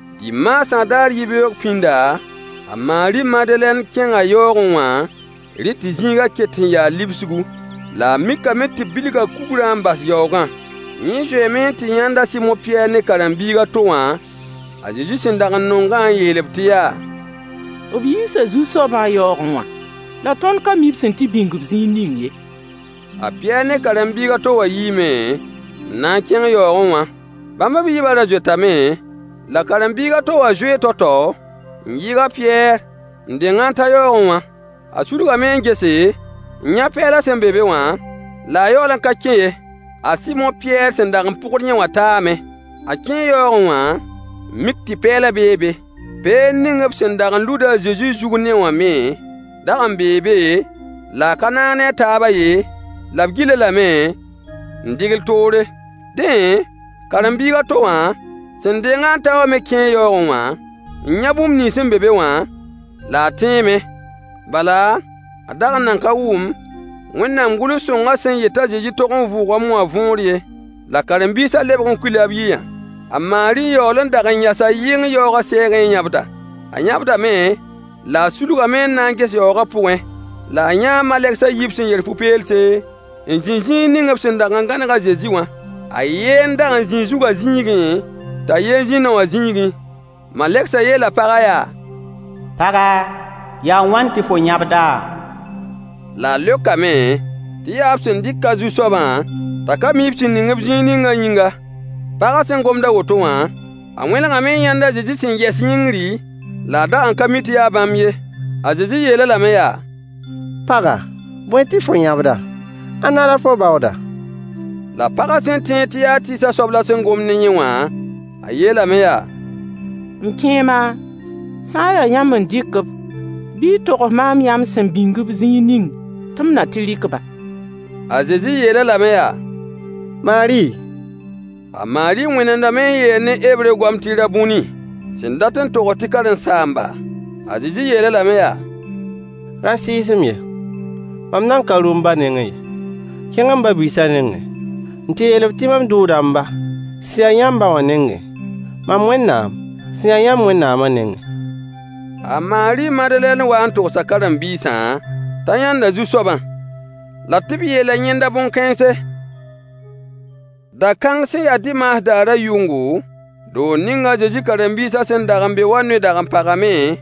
Dimaasã daar yibeoog pĩnda, a Maari Madelɛn kẽnga yaoogẽ wã, rẽ tɩ zĩigã ket n yaa libsgu. La a mikame tɩ b bilga kugrã n bas yaoogã. Yẽ zoeeme n tɩ yãnd a Sɩmo Pɩyɛɛr ne karen-biig a to wã a Zezi sẽn dag n nongã, n yeel-b tɩ yaa: B yiisa Zu-soabã yaoogẽ wã, la tõnd ka mi b sẽn tɩ bĩng-b zĩig ning ye. A Pɩyɛɛr ne karen-biig a to wã yiime n na n kẽng yaoogẽ wã. Bãmb b yiibã ra zoetame, la karen-biig a to wã zoee tao-tao n yɩɩg a Pɩyɛɛr, n deng-a n ta yaoogẽ wã. A sulgame n gese, n yã pɛɛlã sẽn be be wã, la a yaool n ka kẽ ye. A Sɩmo Pɩyɛɛr sẽn dag n pʋgd yẽ wã taame. A kẽe yaoogẽ wã, n mik tɩ pɛɛlã bee be. Peend ning b sẽn dag n lud a Zezi zug ne-wã me dag n bee be, la a ka naag ne a taabã ye, la b gil-a lame n dɩgl toor. Dẽ, karen-biig a to wã, sẽn deng-a n ta wã me kẽe yaoogẽ wã n yã bũmb nins sẽn be be wã, la a tẽeme. Bala, a dag n nan ka wʋm Wẽnnaam gʋls-sõngã sẽn yet t'a Zezi tog n vʋʋgame wã võor ye. La karen-biisã lebg n kuila b yiya. A Maari yaool n dag n yasa yɩng yaoogã sɛɛgẽ n yãbda. A yãbdame, la a sulgame n na n ges yaoogã pʋgẽ, la a yãa malegs a yiib sẽn yer fu-peelse, n zĩ zĩig ning b sẽn dag n gãneg a Zezi wã. A yen dag n zĩi zugã zĩigẽ, t'a yen zĩ nao wã zĩigẽ. Malegsã yeela pagã yaa: Paga, yaa wãn tɩ fo yãbda? La a leokame tɩ yaa b sẽn dɩk a Zu-soabã t'a ka mi b sẽn ning-b zĩig ningã yĩnga. Pagã sẽn gomd a woto wã, a wẽnegame n yãnd a Zezi sẽn yɛs yĩngri, la a dag n ka mi tɩ yaa bãmb ye. A Zezi yeel-a lame yaa: Paga, bõe tɩ fo yãbda? Ãnna la fo baooda? La pagã sẽn tẽed tɩ yaa tɩɩsã soab la sẽn gomd ne yẽ wã, a yeelame yaa: M kẽema, sã n yaa yãmb n dɩk-b bɩ y togs maam yãmb sẽn bĩng-b zĩig ning tɩ m na tɩ rɩk-ba. A Zezi yeel-a lame yaa: Maari! A Maari wẽnemdame n yeel ne hebre goam tɩ rabuni, sẽn dat n togs tɩ karen-saamba. A Zezi yeel-a lame yaa: Ra sɩɩs-m ye. Mam nan ka rʋ m ba nengẽ ye. Kẽng m ba-biisã nengẽ n tɩ yeel-b tɩ mam dʋʋda m ba sẽn ya yãmb ba wã nengẽ, mam Wẽnnaam sẽn ya yãmb Wẽnnaamã nengẽ. A Maari Madelɛn waa n togsa karen-biisã t'a yãnda Zu-soabã, la tɩ b yeela yẽnda bõn-kãense. Da-kãng sẽn ya dimaas daarã yʋngo, doog ning a Zezi karen-biisã sẽn dag n be wã noy dag n pagame,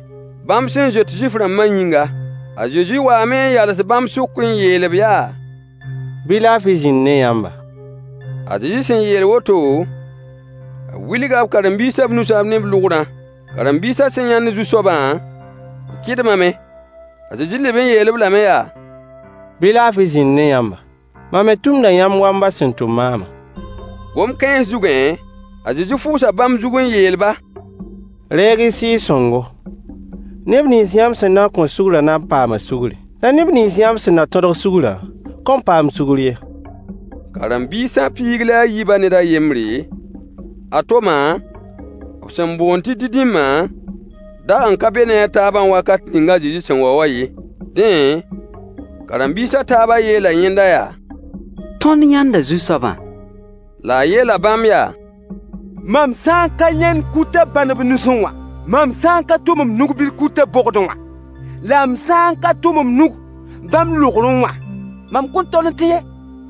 bãmb sẽn zoet Zuif-rãmbã yĩnga. A Zezi waame n yals bãmb sʋk n yeel-b yaa: Bɩ laafɩ zĩnd ne yãmba! A Zezi sẽn yeel woto, b wilga b karen-biisã b nusã ne b lʋgrã. Karen-biisã sẽn yãnd Zu-soabã, b kɩdmame. A Zezi leb n yeel-b lame yaa: Bɩ laafɩ zĩnd ne yãmba! Mam me tʋmda yãmb wa m ba sẽn tʋm maamã. Gom-kãens zugẽ, a Zezi fʋʋsa bãmb zug n yeel-ba: Reeg-y Sɩɩg-sõngo. Neb nins yãmb sẽn na n kõ sugrã na n paama sugri, la neb nins yãmb sẽn na tõdg sugrã kõn paam sugr ye. Karen-biisã piig la a yiibã ned a yembre, a Toma b sẽn boond tɩ Didimã dag n ka be ne a taabã wakat ning a Zezi sẽn wa wã ye. Dẽ, karen-biis a taabã yeela yẽnda yaa: Tõnd yãnda Zu-soabã! La a yeela bãmb yaa: Mam sã n ka yãnd kutã bãn b nusẽ wã, mam sã n ka tʋm m nug-bil kutã bogdẽ wã, la m sã n ka tʋm m nug bãmb lʋgrẽ wã, mam kõn tol n tẽ ye.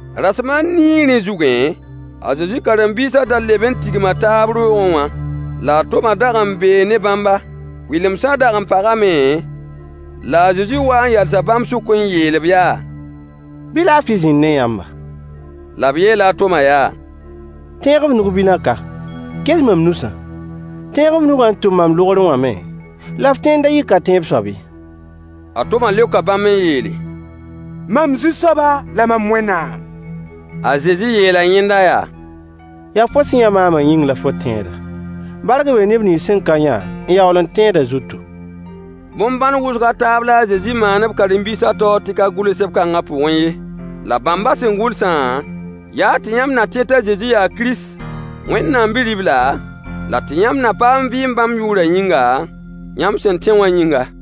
Rasem a nii rẽ zugẽ, a Zezi karen-biisã da leb n tigma taab roogẽ wã, la a Toma dag n bee ne bãmba. Kʋɩlemsã dag n pagame, la a Zezi waa n yalsa bãmb sʋk n yeel-b yaa: Bɩ laafɩ zĩnd ne yãmba! La b yeela a Toma yaa: Tẽeg f nug-bilã ka. Ges mam nusã. Tẽeg f nugã n tʋm mam lʋgrẽ wã me, la f tẽ n da yɩ ka-tẽeb soab ye. A Toma leoka bãmb n yeele: Mam Zu-soaba la mam Wẽnnaam! A Zezi yeela yẽnda yaa: Yaa fo sẽn yã maamã yĩng la fo tẽeda. Bark bee neb nins sẽn ka yã n yaool n tẽedã zutu. Bõn-bãn wʋsg a taab la a Zezi maan b karen-biisã taoor tɩ ka gʋls seb-kãngã pʋgẽ ye. La bãmbã sẽn gʋlsã, yaa tɩ yãmb na tẽ t'a Zezi yaa Kirist, Wẽnnaam Bi-ribla, la tɩ yãmb na paam vɩɩm bãmb yʋʋrã yĩnga, yãmb sẽn tẽ wã yĩnga.